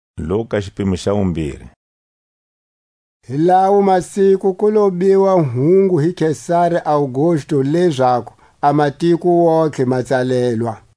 A kubelekiwa ka Jesu. Hi lawo masiku ku lo biwa hungu hi Kesari Augustu lezaku a matiko wontihe ma tsalelwa.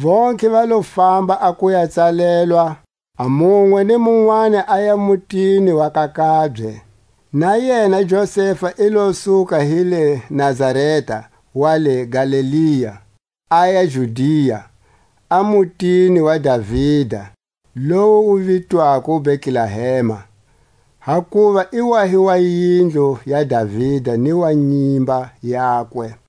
Vontlhe va lo famba a ku ya tsalelwa; a munwe ni munwani aya mutini wa ka kabye. Na yena Josefa i lo suka hi le Nazareta wa le Galilea, aya Judia, a mutini wa Davida, lowu wu vitwako Betlehema, hakuva i wa hi wa yindlu ya Davida ni wa nyimba yakwe;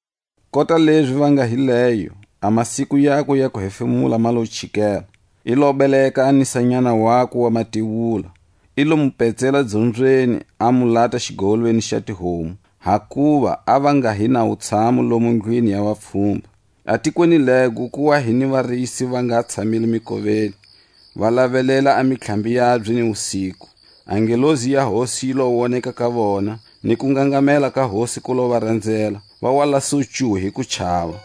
Kota lezi va nga hi leyo, a masiku yakwe ya ku hefemula ma lo chikela. I lo beleka a nisanyana wakwe wa matewula; i lo mu petsela dzobyeni, a mu lata xigowolweni xa tihomu, hakuva a va nga hi na wutshamu lomo ndlwini ya vapfhumba. A tikweni lego ku wa hi ni varisi va nga tshamile mikoveni, va lavelela a mitlhambi yabye ni wusiku. A ngelosi ya Hosi yi lo woneka ka vona, ni kungangamela ka Hosi ku lo va ranzela; va wa la su ncu hi kuchava.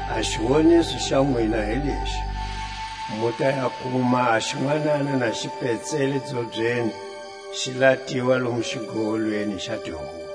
A xiwoniso xa nwina hi lexi: Mu ta ya kuma a xinwanana na xi petselwe dzobyeni, xi latiwa lomu xigowolweni xa tihomu.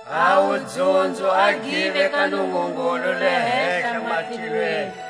A wudzunzo a give ka Nungungulu le hehla matilweni,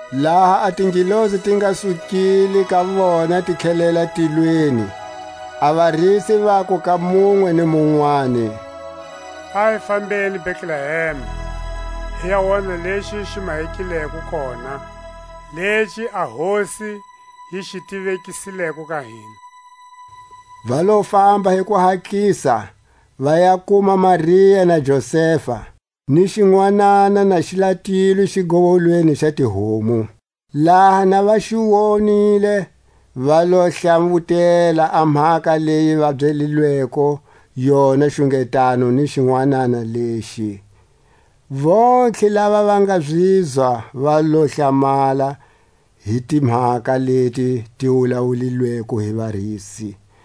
Laha a tingelosi ti nga sukile ka vona ti tlhelela tilweni, a varisi vaku ka munwe ni munwani: A hi fambeni Betlehema, hi ya wona lexi xi mahekileko kona, lexi a Hosi yi xi tivekisileko ka hina. Va lo famba hi kuhatlisa, va ya kuma Maria na Josefa, ni xinwanana na xi latilwe xigowolweni xa tihomu. Laha na va xi wonile, va lo hlawutela a mhaka leyi va byelilweko yona xungetano ni xinwanana lexi. Vontlhe tava va nga zizwa va lo hlamala hi timhaka leti ti wulawulileko hi varisi.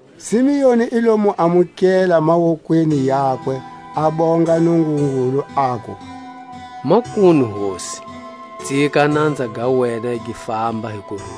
Simeoni i lo mu amukela mawokweni yakwe, a bonga Nungungulu, aku: Makunu Hosi, tsika a nanza ga wena gi famba hi kurula,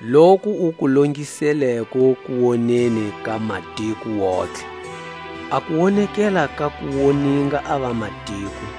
Loku u ku longisileko kuwoneni ka matiko wontihe; A kuwonekela ka ku woninga a vamatiko,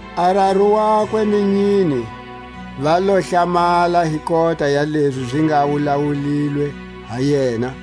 A raru wakwe ni nyine va lo hlamala hi kota ya lezi zi nga wulawulilwe ha yena.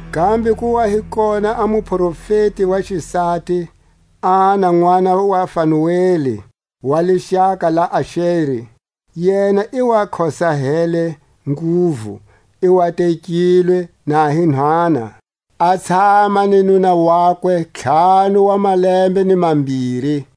Kambe ku wa hi kona a muprofeti wa xisati, Ana nʼwana wa Fanueli, wa lixaka la Axeri. Yena i wa khosahele nguvu; i wa tekilwe na hi nhwana, a tshama ni nuna wakwe ntlhanu wa malembe ni mambiri;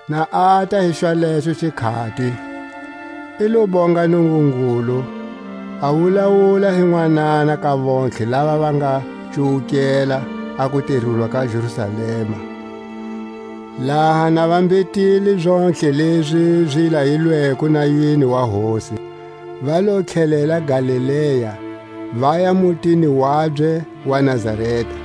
Na ata hi xwalexo xikhati, i lo bonga Nungungulu, a wulawula hi nwanana ka vontlhe lava va nga cuwukela a kutirulwa ka Jerusalema. Laha ne va mbhetile zontlhe lezi zi layilweko nayweni wa Hosi, va lo tlhelela Galilea, vaya mutini wabye wa Nazareta.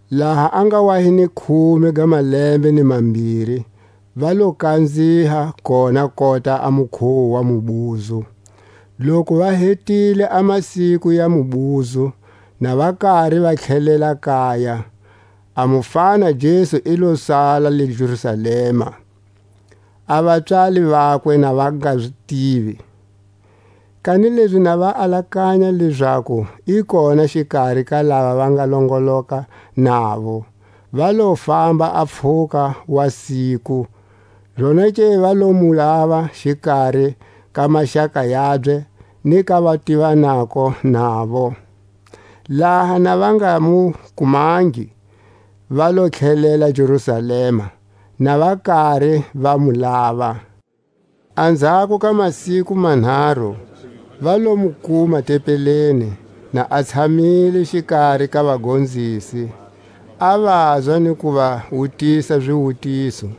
Laha a nga wa hi ni khume ga malembe ni mambiri va lo kanziha kona kota a mukhuwo wa mubuzo. Loku va hetile a masiku ya mubuzo, na va kari va tlelela kaya, a mufana Jesu i lo sala le Jerusalema, a vapswali vakwe na va nga zi tivi. Kanilezi na va alakanya lezaku i kona xikari ka lava va nga longoloka navo, va lo famba a pfhuka wa siku; zonake va lo mu lava xikari ka maxaka yabye ni ka vativanako navo. Laha na va nga mu kumangi, va lo tlhelela Jerusalema, na va kari va mu lava. Anzhako ka masiku manharu va lo mu kuma tempeleni, na a tshamile xikari ka vagonzisi, a vazwa ni ku va wutisa ziwutiso;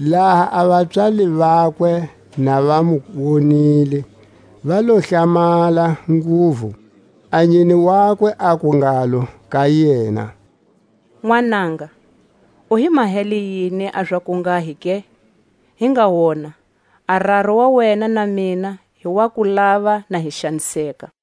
Laha a vapswali vakwe na va mu wonile, va lo hlamala nguvu; a nyine wakwe aku ngalo ka yena: Nwananga, u hi mahele yini a za kunghahi ke? Hi nga wona, a raru wa wena na mina hi wa ku lava na hi xaniseka.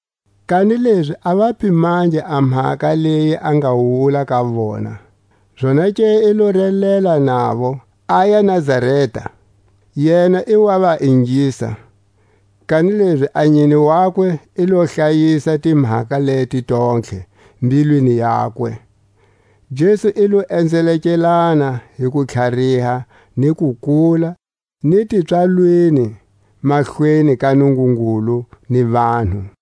Kanilezi a va pimangi a mhaka leyi a nga wula ka vona. Zonake i lo relela navo, aya Nazareta; yena i wa va ingisa; kanilezi a nyine wakwe i lo hlayisa timhaka leti tontlhe mbilwini yakwe. Jesu i lo enzelekelana hi kutlhariha ni kukula, ni tipswalweni mahlweni ka Nungungulu ni vanhu.